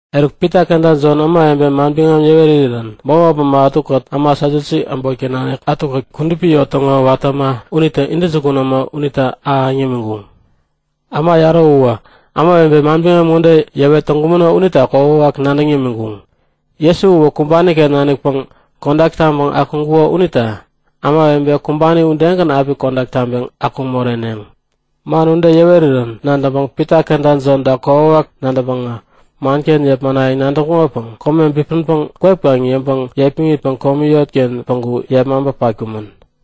Eruk Pita kenta Jon ämawebe manbiŋam yäwerirän bämop äma ätukät äma Satyusi äbotken nanikkät kudupi yot täŋo watä äma unitäŋo intäjukun äma unitä ahäŋ yämiŋkuŋ. Äma yarä uwä ämawebe manbiŋam ŋode yäwet täŋkumäno unita kokwawak nadäŋ yämiŋkuŋ; Jesu uwä kumbani-ken nanikpäŋ kodak taŋpäŋ akuŋkuko unita ämawebe kumbani udegän api kodak taŋpeŋ akuŋ moreneŋ. Man ude yäwerirän nadäŋpäŋ Pita kenta Jonta kokwawak nadäŋpäŋä manken yepmanayäŋ nadäŋkuŋopäŋ kome bipänpäŋ kwep kaŋ yäŋpäŋ yepmäŋitpäŋ jop komi yotken päŋku yepmaŋpä patkumän.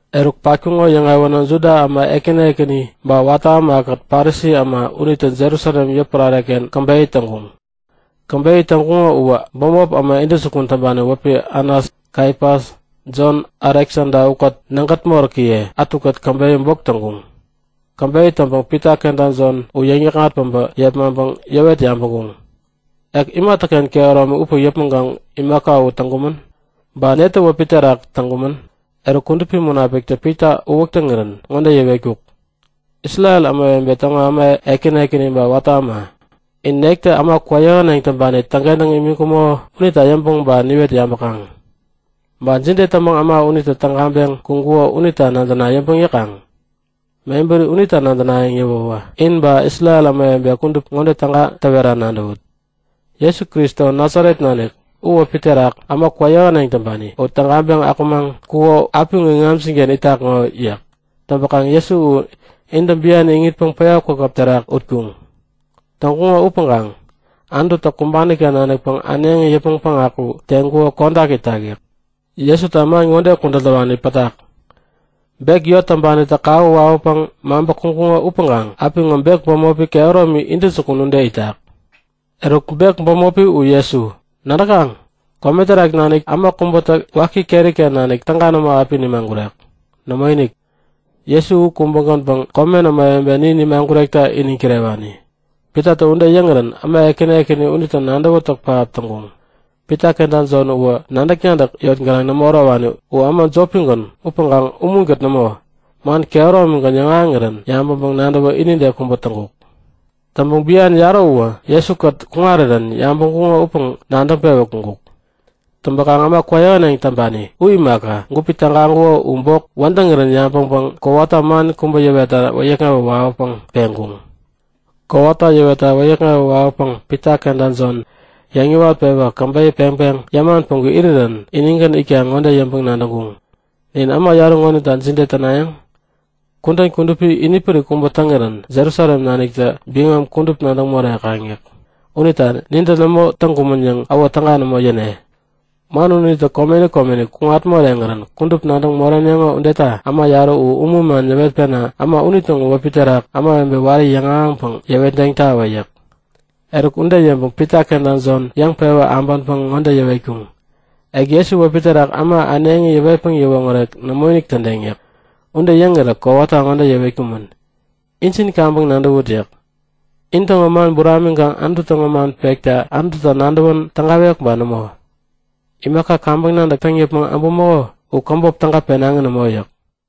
Eruk patkuŋo yäŋewänä Juda äma ekäni ekäni, ba watä ämakät Parisi äma unitä Jerusalem yotpärare-ken käbeyä täŋkuŋ. Käbeyä täŋkuŋo uwä bämop äma intäjukun täŋpani wäpi Anas, Kaifas, Jon, Aleksada ukät nägät moräkiye ätukät käbeyä bok täŋkuŋ. Käbeyä täŋpäŋ Pita kenta Jon u yäŋ-yäkŋat päbä yepmaŋpäŋ yäwet yabäŋkuŋ; Ek imatäken kehäromi upäŋ yäpmäŋkaŋ imaka u täŋkumän? Ba netä wäpi terak täŋkumän? Eruk, Kudupi Munapiktä Pita uwäk täŋirän ŋode yäwetkuk; Isrel ämawebe täŋo äma ekäni ekäni ba watä äma, in nektä äma kwäyähäneŋ täŋpani täŋkentäŋ imiŋkumäko unita yäŋpäŋ ba niwet yabäkaŋ? Ba jide täŋpäŋ äma unitä tägaŋpeŋ kuŋkuko unita nadäna yäŋpäŋ yäkaŋ? Mebäri unita nadänayäŋ yäwäwä in ba Isrel ämawebe kudup ŋode täwera nadäwut; Jesu Kristo, Nasaret nanik u wäpi terak äma kwäyähäneŋ täŋpani u tägaŋpeŋ akumaŋ kuko apiŋo iŋamjin-ken itak ŋo yäk. Täŋpäkaŋ Jesu u intä bian iŋitpäŋ päya kwakäp terak utkuŋ. Täŋkuŋo upäŋkaŋ Anututä kumbani-ken nanikpäŋ äneŋi yäpmäŋ päŋaku teŋkuko kodak itak yäk. Jesuta man ŋode kudän täwani pätak; Bek yot täŋpanitä kawä wawäpäŋ maŋpä kuŋkuŋo upäŋkaŋ apiŋo bek bämopi kehäromi intäjukun ude itak. Eruk bek bämopi u Jesu. Nadäkaŋ? Kome terak nanik äma kubätä waki keri-ken nanik täga nämo api nimagurek. Nämoinik! Jesu u kubägänpäŋ komen ämawebe nin nimagurekta iniŋ kirewani. Pitatä ude yäŋirän äma ekäni ekäni unitä nadäwätäk pähap täŋkuŋ. Pita kenta Jon uwä nadäk-nadäk yot gänaŋ nämo ärowani. U äma jopigän upäŋkaŋ umunkät nämo, man kehäromigän yäŋahäŋirän yabäŋpäŋ-nadäwä inide kubä täŋkuk. Täŋpäŋ bian yarä uwä Jesu-kät kuŋarirän yabäŋkuŋo upäŋ nadäŋpewä kuŋkuk. Täŋpäkaŋ äma kwäyähäneŋ täŋpani u imaka, gupi tägaŋkuko u bok wädäŋirän yabäŋpäŋ kowata man kubä yäwetta wäyäkŋewä wawäpäŋ peŋkuŋ. Kowata yäwetta wäyäkŋewä wawäpäŋ Pita kenta Jon yäŋ-yäwat-pewä käbeyä peŋpäŋ yäman päŋku irirän inigän itkaŋ ŋode yäŋpäŋ-nadäŋkuŋ; Nin äma yarä ŋonita jide tänayäŋ? Kudän kudupi inipärik kubä täŋirän Jerusalem naniktä biŋam kudup nadäŋ morekaŋ yäk. Unita nintä nämo täŋkumän yäŋ äwo täga nämo yäne. Man unitä komeni komeni kuŋat moreŋirän kudup nadäŋ moreneŋo udeta äma yarä u umun man yäwetpena äma unitäŋo wäpi terak ämawebe wari yäŋahäŋpäŋ yäwetdeŋtawä yäk. Eruk, ude yäŋpäŋ Pita kenta Jon yäŋpewä äbänpäŋ ŋode yäwetkuŋ; Ek Jesu wäpi terak äma äneŋi yäwetpäŋ yäwoŋärek nämoinik tädeŋ yäk. Ude yäŋirä kowata ŋode yäwetkumän; Injin kaŋpäŋ nadäwut yäk. In täŋo man buramiŋkaŋ Anutu täŋo man pekta Anututä nadäwän tägawek ba nämo? Imaka kaŋpäŋ nadäk täŋ yäpmäŋ äbumäko u käbop täga penaŋi nämo yäk.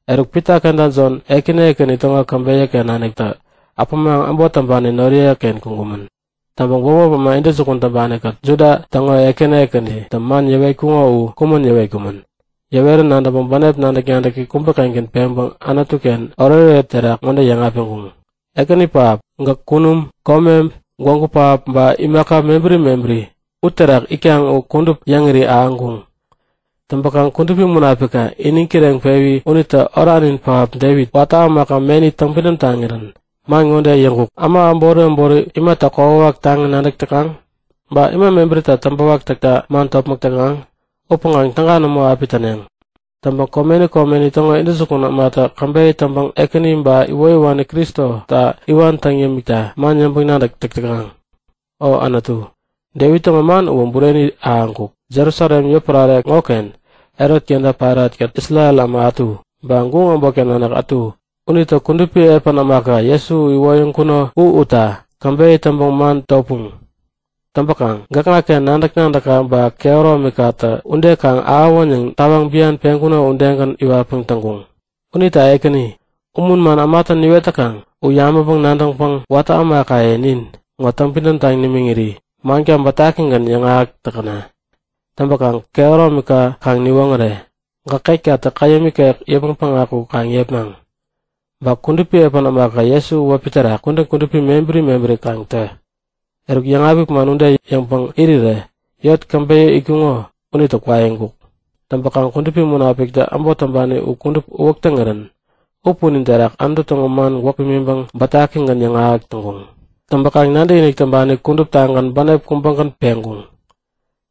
Eruk, Pita kenta Jontä ekäni ekäni täŋo käbeyä-ken naniktä äpämaŋ äbot täŋpani noriye-ken kuŋkumän. Täŋpäŋ bämop äma intäjukun täŋpani-kät Juda täŋo ekäni ekänitä man yäwetkuŋo u kumän yäwetkumän. Yäwerän nadäŋpäŋ bänep nadäk-nadäki kubä-kengän peŋpäŋ Anutu-ken oretoret terak ŋode yäŋapiŋkuŋ; Ekäni pähap, gäk kunum, kome, gwägu pähap ba imaka mebäri mebäri uterak itkaŋ u kudup yäŋiri ahäŋkuŋ. Täŋpäkaŋ Kudupi Munapikka iniŋ kireŋpewi unitä oranin pähap Devit, watä ämaka meni täŋpidäm taŋirän man ŋode yäŋkuk; Äma äbori äbori imata kokwawak taŋi nadäk täkaŋ? Ba ima mebärita täŋpäwak täkta man topmäk täkaŋ? Upäŋkaŋ täga nämo api täneŋ. Täŋpäŋ komeni komeni täŋo intäjukun ämatä käbeyä täŋpäŋ Ekäni ba iwoyäwani Kristota iwan täŋ yämikta man yäŋpäŋ-nadäk täk täkaŋ. O Anutu, Devit täŋo man uwä bureni ahäŋkuk. Jerusalem yotpärare ŋoken Herot kenta Pailat-kät Isrel äma ätu, ba guŋ äbotken nanik ätu unitä kudupi epän ämaka Jesu iwoyäŋkuno u utta käbeyä täŋpäŋ man topuŋ. Täŋpäkaŋ gäkŋaken nadäk-nadäkka ba kehäromikatä ude kaŋ ahäwän yäŋ tawaŋ bian peŋkuno udegän iwatpäŋ täŋkuŋ. Unita Ekäni, umun man ämatä niwet täkaŋ u yabäŋpäŋ-nadäŋpäŋ watä ämakaye nin ŋo täŋpidäm taŋ nimiŋiri manka bätakigän yäŋahäk täkäna! Täŋpäkaŋ kehäromika kaŋ niwoŋäre. Gäk ketkatä käyäm ikek yäpmäŋ päŋaku kaŋ yepmaŋ. Ba kudupi epän ämaka Jesu u wäpi terak kudän kudupi mebäri mebäri kaŋ tä. Eruk, yäŋapik man ude yäŋpäŋ irirä yot käbeyä itkuŋo unitä kwaiŋkuk. Täŋpäkaŋ Kudupi Munapiktä äbot täŋpani u kudup uwäk täŋirän u punin terak Anutu täŋo man gwäk pimiŋpäŋ bätakigän yäŋahäk täŋkuŋ. Täŋpäkaŋ nadäkinik täŋpani kuduptagän bänep kubägän peŋkuŋ.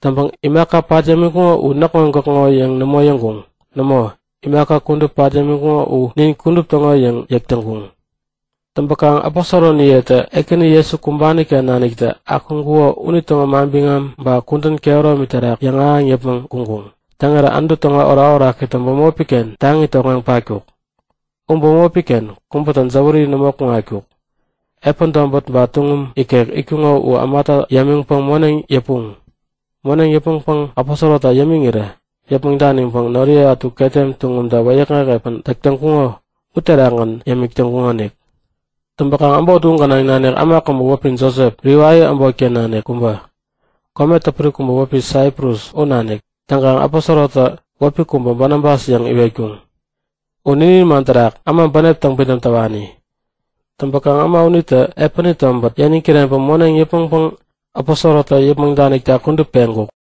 Täŋpäŋ imaka pat yämiŋkuŋo u näkŋo-gäkŋo yäŋ nämo yäŋkuŋ. Nämo, imaka kudup pat yämiŋkuŋo u nin kudup täŋo yäŋ yäk täŋkuŋ. Täŋpäkaŋ aposoroniyetä Ekäni Jesu kumbani-ken naniktä akuŋkuko unitäŋo manbiŋam man ba kudän kehäromi terak yäŋahäŋ yäpmäŋ kuŋkuŋ. Täŋirä Anutu täŋo orakorakitä bämopi-ken taŋi tokŋeŋ patkuk. U bämopi-ken kubätä jäwäri nämo kuŋatkuk. Epän tobät ba tuŋum ikek itkuŋo u ämata yämiŋpäŋ moneŋ yäpuŋ. Moneŋ yäpmäŋpäŋ aposorota yämiŋirä yäpmäŋ daniŋpäŋ noriye ätu ketem tuŋumta wäyäkŋek epän täk täŋkuŋo uterakgän yämik täŋkuŋonik. Täŋpäkaŋ äbot u gänaŋ nanik äma kubä wäpi Josep, Livai äbotken nanik kubä, kome täpuri kubä wäpi Saiprus u nanik. Täŋkaŋ aposorotä wäpi kubä Banabas yäŋ iwetkuŋ. U ninin man terak äma bänep täŋpidäm täwani. Täŋpäkaŋ äma unitä epäni tobät yäniŋ kireŋpäŋ moneŋ yäpmäŋpäŋ aposorotä yäpmäŋ danikta kudup peŋkuk.